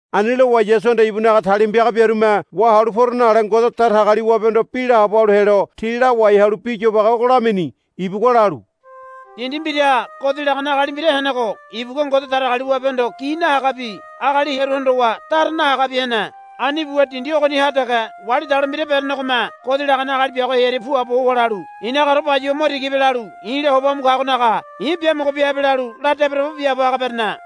Ani lowa Yasuhanda ibunaga talima piaga biarume, Wahalu poro, nale Ngode Datagaliwabehondo bi laabo halu helo ti lawai halu bi yobage ogo lamini. Ibugua lalu, Dindi mbiraha godi lagane agali mbira henego ibugua Ngode Datagaliwabehondo gi nahagabi agali hearu hondowa dara nahagabi hene. Ani buwa dindi ogoniha dege wali dalo mbira berenegome godi lagane agali biago hearia puabo howa lalu, I̱nagaore bayuwa mo tiga bia halu i̱la hoba mu kagonaga i̱ biamogo bia habe, lalu la debodebo biaabo haga berene.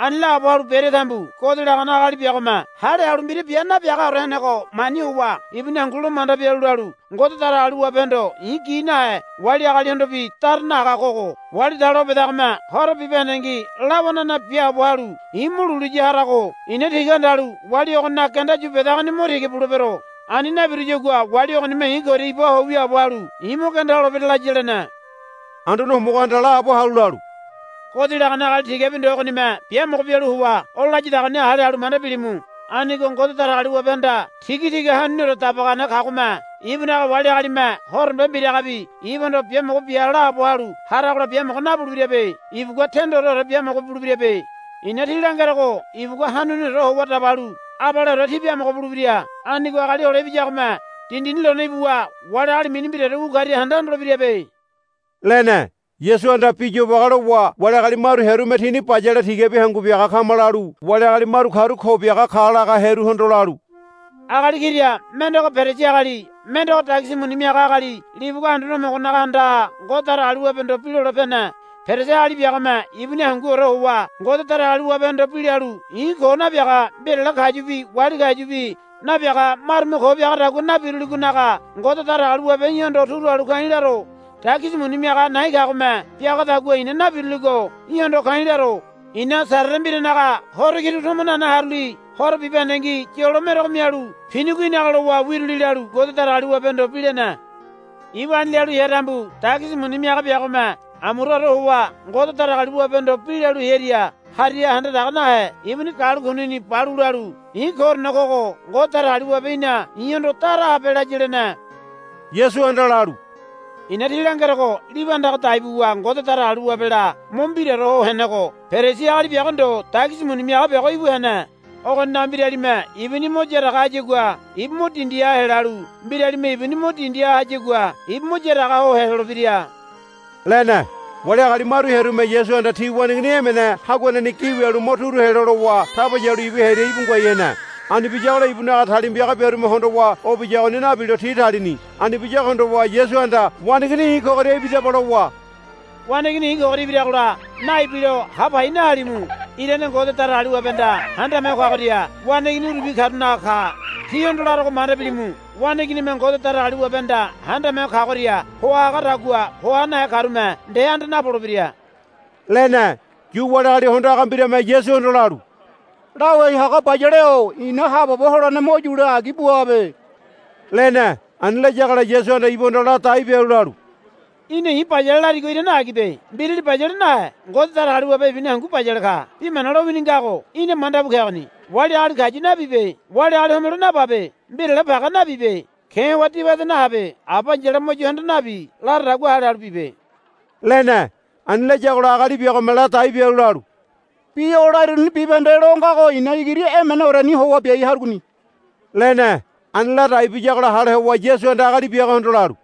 Ani laabo halu berea tambu godi lagane agali biagome hale halu mbira bia nabiagaore henego mani howa ibuni hangu lo manda bialu lalu, Ngode Datagaliwabehondo i̱ gi nahe wali agalihondobi dara nahaga kogo wali dalo o bedagome horo bibahendengi lawanana biaabo halu i̱ mo lulu ya harago i̱na tiga handalu wali ogoninaga genda yu bedagoni mo tiga bulebero. Ani nabiruyagua wali ogonime i̱ koria iba ho wiaabo halu i̱ mo genda holebira, laya, lene. Anduane Homogohanda laabo halu lalu, Godi lagane agali tigabi ndo ogonime biamogo bialu howa o layadagoni hale halu manda bilimu. Anigo Ngode Datagaliwabehanda tigatiga hanuniore dabagane kagome ibunaga wali agalime horombe mbiragabi ibuhondo, Biamogo bia, laabo halu haragola biamogo nabulebirabe. Ibugua tendoreore biamogo bulebirabe. I̱na tí langerogo ibugua hanuniore howa dabalu abaleore ti biamogo bulebira. Anigo Agali Hole Ibiyagome dindini lone ibuwa wali agali mini mbiraore wu karia handa hondolebirabe, lene. Yasuhanda bi yobage lowa wali agali maru hearume tini bayale tigabi hangu biaga kama lalu wali agali maru karu ko biaga ka laga hearuhondo lalu, Agali kira mendego Perisi agali mendego dagisi muni miaga agali libugua Anduane Homogonaga andaha Ngode Datagaliwabehondo bi lole pene. Perisi agali biagome ibuni hanguore howa Ngode Datagaliwabehondo bi lalu, I̱ ko nabiaga mbirale kayubi wali kayubi nabiaga marume ko biagadagua nabiruligonaga Ngode Datagaliwabe í̠hondo turu halu ka̱i̱ laro. Dagisi muni miaga na̱i̱ kagome biagadagua i̱na nabiruligo í̠hondo ka̱i̱ laro. I̱na Sarere mbiranaga horo kiru tomo nane haruli horo bibahendengi yolo merogo mialu pinigo í̠naga lowa wiruli, lalu Ngode Datagaliwabehondo bi lene. Ibu ani lalu hea tambu dagisi muni miaga biagome amuraore howa Ngode Datagaliwabehondo bi lalu hearia hariha handa daga nahe ibuni galu kunini balu lalu, I̱ koorene kogo Ngode Datagaliwabe í̠na i̱hondo dara habe, laya, lene. Yasuhanda lalu, I̱na tí langerogo libu andaga dai buwa Ngode Datagaliwabela mo mbiraore ho henego Perisi agali biago ndo dagisi muni miaga biago ibu hene. Ogoninaga mbiralime ibuni mo yaraga hayagua ibu mo dindiha helalu mbiralime ibuni mo dindiha hayagua ibu mo yaraga ho helolebira, lene. Wali agali maru hearume Yasuhanda ti waneigini emene haguaneni gi wialu mo turu helo lowa taba yalu ibu hearia íbu ngoai hene. Ani biyagola ibunaga talima piaga biarume hondowa o biyagoni nabilo ti talini. Ani biyago hondowa Yasuhanda, Waneigini i̱ kogoria ibidaba, lowa, Waneigini i̱ kogoria ibiragola naibilo ha pai nahalimu. Irane Ngode Datagaliwabehanda Handame Ho Kagoria waneigini urubi karunaga ka. Tíhondo larogo manda bilimu. Waneiginime Ngode Datagaliwabehanda Handame Ho Kagoria hoa hagadagua hoa nahe karume nde anda napolebira, lene. Yu wali agali hondo haga mbirame Yasuhondo lalu, Lawai haga bayale-o i̱na haabobo holene mo yule agi buabe, lene. Ani layagola Yasuhanda ibuhondo ladai bialu lalu, Í̠na i̱ bayale larigo irane agibe. Mbirali bayale nahe Ngode Datagaliwabe ibuni hangu bayale ka. Bi mana lowini ngago í̠na manda bu kegoni. Wali agali kayu nabibe. Wali agali homelo nababe. Mbirale page nabibe. Ke̱ howa dibade nahabe. Aba ai̱yala mo yo handa nabi laradagua hale halu bibe, lene. Ani layagola agali biagome ladai bialu lalu, Bi o lariruni bibahende lo ngago i̱na igiri emeneoreni howa biai harugoni, lene. Ani ladai biyagola hale howa Yasuhanda agali biagohondo lalu,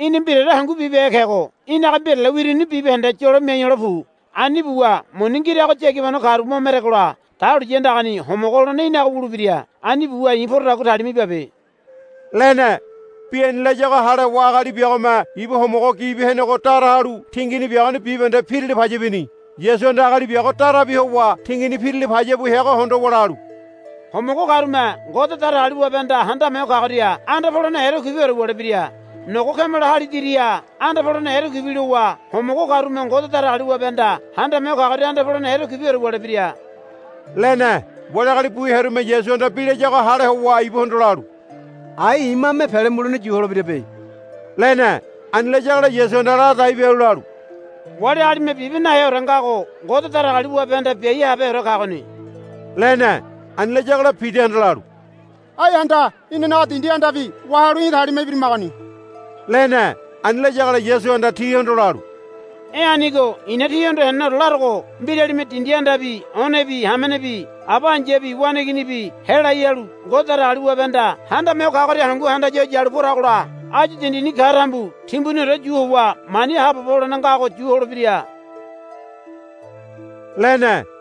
Í̠na mbiraore hangu bibehe kego í̠naga mbirale wiruni bibahende yolo miai hole pu. Ani buwa muni ngirago yagibano karu mo meregola dahuliya andagani homogo holene í̠naga wulebira. Ani buwa i̱ porodagua talima ibabe, lene. Bi ani layago hale howa agali biagome ibu homogo gibi henego dara halu tingini biagoni bibahende pirila paya bini. Yasuhanda agali biago darabi howa tingini pirila paya bu heago hondowa lalu, Homogo karume Ngode Datagaliwabehanda Handame Ho Kagoria anda polene erekuibiore wulebira. Nogo kameleme háli diriha anda polene erekuibi lowa homogo karume Ngode Datagaliwabehanda Handame Ho Kagoria anda polene erekuiore wulebira, lene. Wali agali bu hearume Yasuhanda bi layago hale howa ibuhondo lalu, Ai imame pele mulene yu holebirabe, lene. Ani layagola Yasuhanda ladai bialu lalu, Wali agalime bibe naheore ngago Ngode Datagaliwabehanda biai habeheore kagoni, lene. Ani layagola Pidahanda lalu, Ai handa, Inanaga dindi andabi wahalu í̠ talima ibirimagoni, lene. Ani layagola Yasuhanda tihondo lalu, E̱ anigo i̱na tíhondo heneneore larogo mbiralime dindi andabi onebi hamenebi aba ai̱yabi waneiginibi helai halu Ngode Datagaliwabehanda Handame Ho Kagoria hangu handaya ho yalu poragola áyu dindini ka tambu timbuniore yu howa mani haabobo holene ngago yu holebira, lene.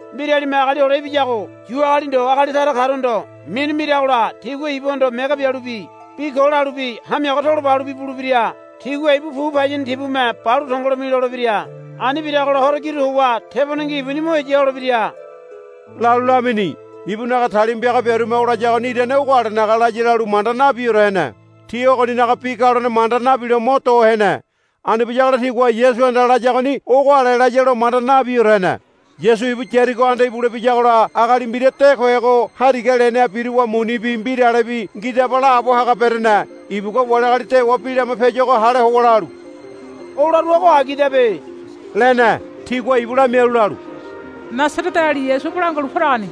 Mbiralime Agali Hole Ibiyago Yu agali ndo agali tara karuhondo minu miragola tigua ibuhondo mege bialubi bi ko lalubi hamiaga tolo ba halubi bulebira. Tigua ibu pu payini tibume balu tongolo milolebira. Ani biragola horo kiru howa tebonengi ibuni mo heya holebira, lalu lamini. Ibunaga talima piaga biarume o layagoni irane ogo alenaga laya lalu manda nabiore hene. Ti ogoninaga bi galone manda nabilo mo do hene. Ani biyagola tigua Yasuhanda layagoni ogo ale layalo manda nabiore hene. Yasu ibu Yarigo anda ibule biyagola agali mbira de kohego hariga leneha biruwa munibi mbiralebi, Ngidaba, laabo haga berene. Ibugua wali agali dewa bi lama piayuago hale howa lalu, O laruago agidabe, lene. Tigua ibu lamialu lalu, Nasareteali Yasu o bolangua halu poragoni,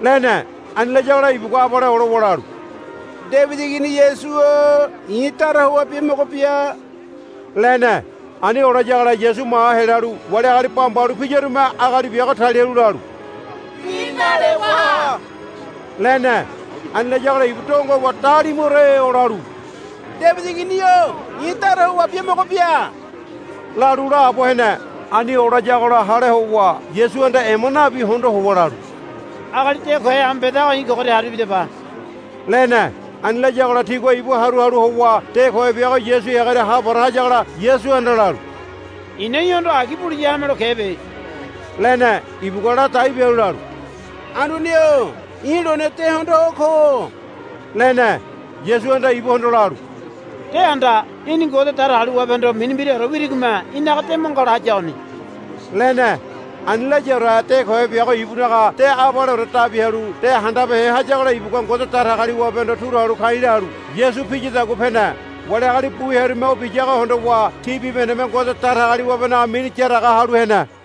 lene. Ani layagola ibugua abale olowa lalu, Debidi Igini Yasu-o i̱ dara howa biamogo bia, lene. Ani olayagola Yasu maha helalu wali agali bamba halu piyarume agali biago talialu lalu, Bi nale waha, lene. Ani layagola ibu donge howa dalimuore olalu, Debidi Igini-o i̱ dara howa biamogo bia, lalu laabo hene. Ani olayagola hale howa Yasuhanda ema nabi hondo howa lalu, Agali de kohe amu bedago i̱ koria haru ibidaba, lene. Ani layagola tigua ibu haru halu howa de kohe biago Yasu heagoria ha para hayagola Yasuhanda lalu, I̱na í̠hondo agi buliya hamelo kebe, lene. Ibugua ladai bialu lalu, Anduane-o i̱ lone de hondoa ko, lene. Yasuhanda ibuhondo lalu, De handa. Í̠ni Ngode Datagaliwabehondo mini mbiraore wirigome í̠naga de mo ngala hayagoni, lene. Ani layaore de kohe biago ibunaga de abaleore dabi halu de handabehe hayagola ibugua Ngode Datagaliwabehondo turu halu ka̱i̱ lalu Yasu piyadagua pene. Wali agali bu hearume o biyago hondowa ti bibahendeme Ngode Datagaliwabenaga mini yaraga halu hene.